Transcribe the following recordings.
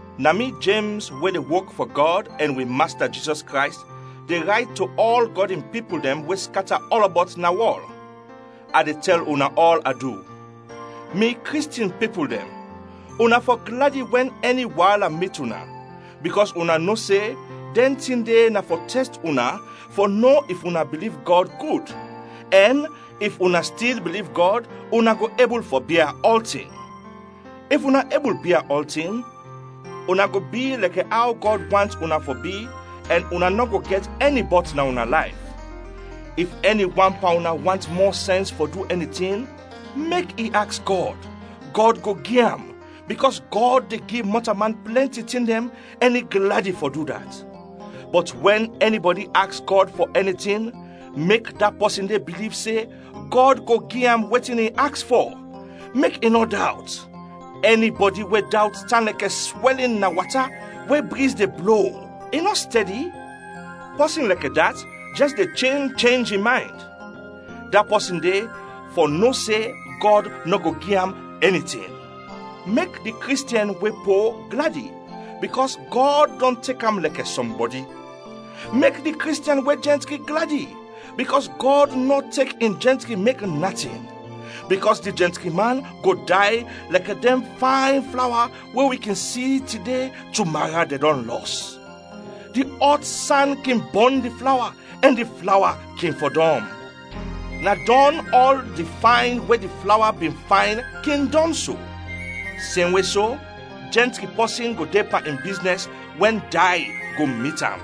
Na mi Jems we de wok fɔ Gɔd ɛn wi Masta Jizɔs Krays, de rayt to ɔl Gɔd in pipul dɛn we skata ɔlɔbɔt na wɔl. A de tɛl una ɔl adu! Mi Kristiɛn pipul dɛn, una fɔ gladi wɛn ɛni waala mit una, bikɔs una no se dɛn tin de na fɔ tɛst una fɔ no if una biliv Gɔd gud; ɛn if una stil biliv Gɔd, una go ebul fɔ bia ɔltin. If una ebul bia ɔltin, una go bi lɛkɛ aw Gɔd want una fɔ bi ɛn una nɔ go gɛt ɛni bɔt na una layf. If ɛni wan pan una want mɔ sɛns fɔ du ɛni tin, mek i aks Gɔd, Gɔd go gi am, bikɔs Gɔd de gi mɔtalman plɛnti tin dɛn ɛn i gladi fɔ du dat. Bɔt wɛn ɛnibɔdi aks Gɔd fɔ ɛni tin, mek da pɔsin de biliv se Gɔd go gi am wetin i aks fɔ, mek i nɔ dawt. Ɛnibɔdi we de dawt tan lɛkɛ swɛlin na wata we briz de blo, i nɔ stɛdi. Pɔsin lɛkɛ dat jɛs de chenj chenj in maynd. Da pɔsin de fɔ no se Gɔd nɔ go gi am ɛni tin. Mek di Kristiɛn we po gladi bikɔs Gɔd dɔn tek am lɛkɛ sɔmbɔdi. Mek di Kristiɛn we jɛntri gladi bikɔs Gɔd nɔ tek in jɛntri mek natin, bikɔs di jɛntri man go day lɛkɛ dɛn fayn flawa we wi kin si tide, tumara dɛn dɔn lɔs. Di ɔt san kin bɔn di flawa, ɛn di flawa kin fɔdɔm. Na dɔn ɔl di fayn we di flawa bin fayn kin dɔn so. Semwe so, jɛntri pɔsin go de pan in biznɛs wɛn day go mit am.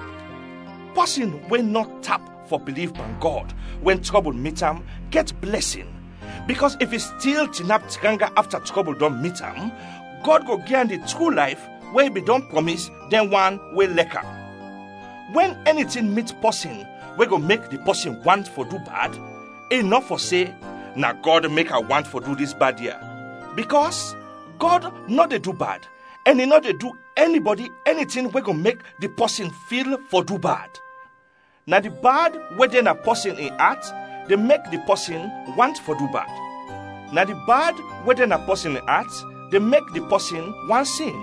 Pɔsin we nɔ tap fɔ biliv pan Gɔd wɛn trɔbul mit am gɛt blɛsin, bikɔs if i stil tinap tranga afta trɔbul dɔn mit am, Gɔd go gi am di tru layf we i bin dɔn prɔmis dɛn wan we lɛk am. Wɛn ɛni tin mit pɔsin we go mek di pɔsin want fɔ du bad, i nɔ fɔ se, “Na Gɔd mek a want du dis bad ya.” Bikɔs Gɔd nɔ de du bad ɛn i nɔ de du ɛnibɔdi ɛni tin we go mek di pɔsin fil fɔ du bad. Na di bad we de na pɔsin in at de mek di pɔsin want fɔ du bad. Na di bad we de na pɔsin at de mek di pɔsin want sin,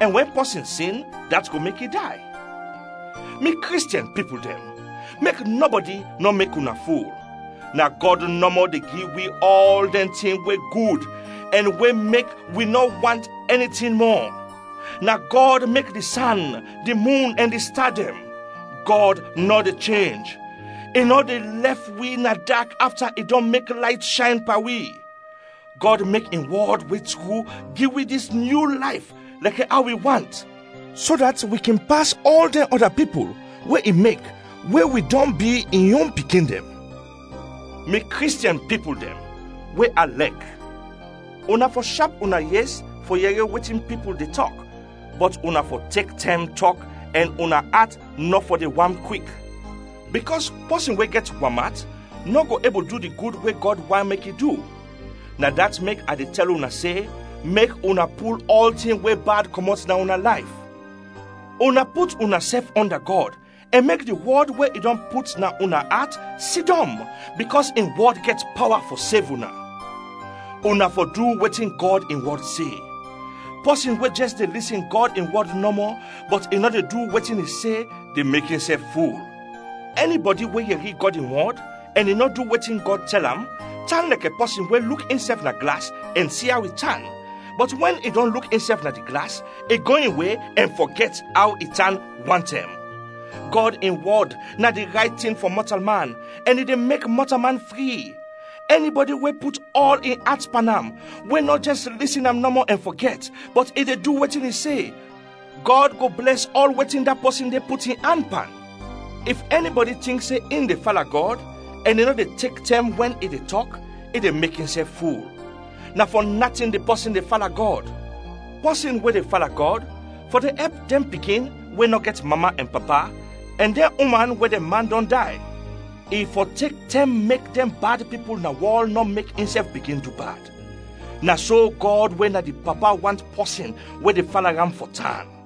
ɛn wɛn pɔsin sin dat go mek i day. Mi Kristiɛn pipul dɛn, mek nɔbɔdi nɔ mek una ful. Na Gɔd nɔmɔ de gi wi ɔl dɛn tin we gud ɛn we mek wi nɔ want ɛni tin mɔ. Na Gɔd mek di san, di mun ɛn di sta dɛn. Gɔd nɔ de chenj, i nɔ de lɛf wi na dak afta i dɔn mek layt shayn pan wi. Gɔd mek in wɔd we tru gi wi dis nyu layf lɛkɛ aw i want, so dat wi kin pas ɔl dɛn ɔda pipul we i mek we wi dɔn bi in yon pikin dɛn. Mi Kristiɛn pipul dɛn we a lɛk, una fɔ shap una yes fɔ yɛri wetin pipul de tɔk, bɔt una fɔ tek tɛm tɔk ɛn una at nɔ fɔ de wam kwik. Bikɔs pɔsin we gɛt wam at nɔ go ebul du di gud we Gɔd want mek i du. Na dat mek a de tɛl una se, mek una pul ɔltin we bad kɔmɔt na una layf. Una put unasɛf ɔnda Gɔd ɛn mek di wɔd we i dɔn put na una at sidɔm, bikɔs in wɔd gɛt pawa fɔ sev una. Una fɔ du wetin Gɔd in wɔd se. Pɔsin we jɛs de lisin Gɔd in wɔd nɔmɔ, bɔt i nɔ de du wetin i se, de mek insɛf ful. Ɛnibɔdi we yɛri Gɔd in wɔd ɛn i nɔ du wetin Gɔd tɛl am, tan lɛkɛ pɔsin we luk insɛf na glas ɛn si aw i tan, bɔt wɛn i dɔn luk insɛf na di glas, i go in we ɛn fɔgɛt aw i tan wantɛm. Gɔd in wɔd na di rayt tin fɔ mɔtalman ɛn i de mek mɔtalman fri; ɛnibɔdi we put ɔl in at pan am, we nɔ jɛs lisin am nɔmɔ ɛn fɔgɛt, bɔt i de du wetin i se, Gɔd go blɛs ɔl wetin da pɔsin de put in an pan. If ɛnibɔdi tink se in de fala Gɔd ɛn i nɔ de tek tɛm wɛn i de tɔk, i de mek insɛf ful. Na fɔ natin di pɔsin de fala Gɔd. Pɔsin we de fala Gɔd fɔ de ɛp dɛn pikin we nɔ gɛt mama ɛn papa ɛn dɛn uman we dɛn man dɔn day. I fɔ tek tɛm mek dɛn bad pipul na wɔl nɔ mek insɛf bigin du bad. Na so Gɔd we na di Papa want pɔsin we de fala am fɔ tan.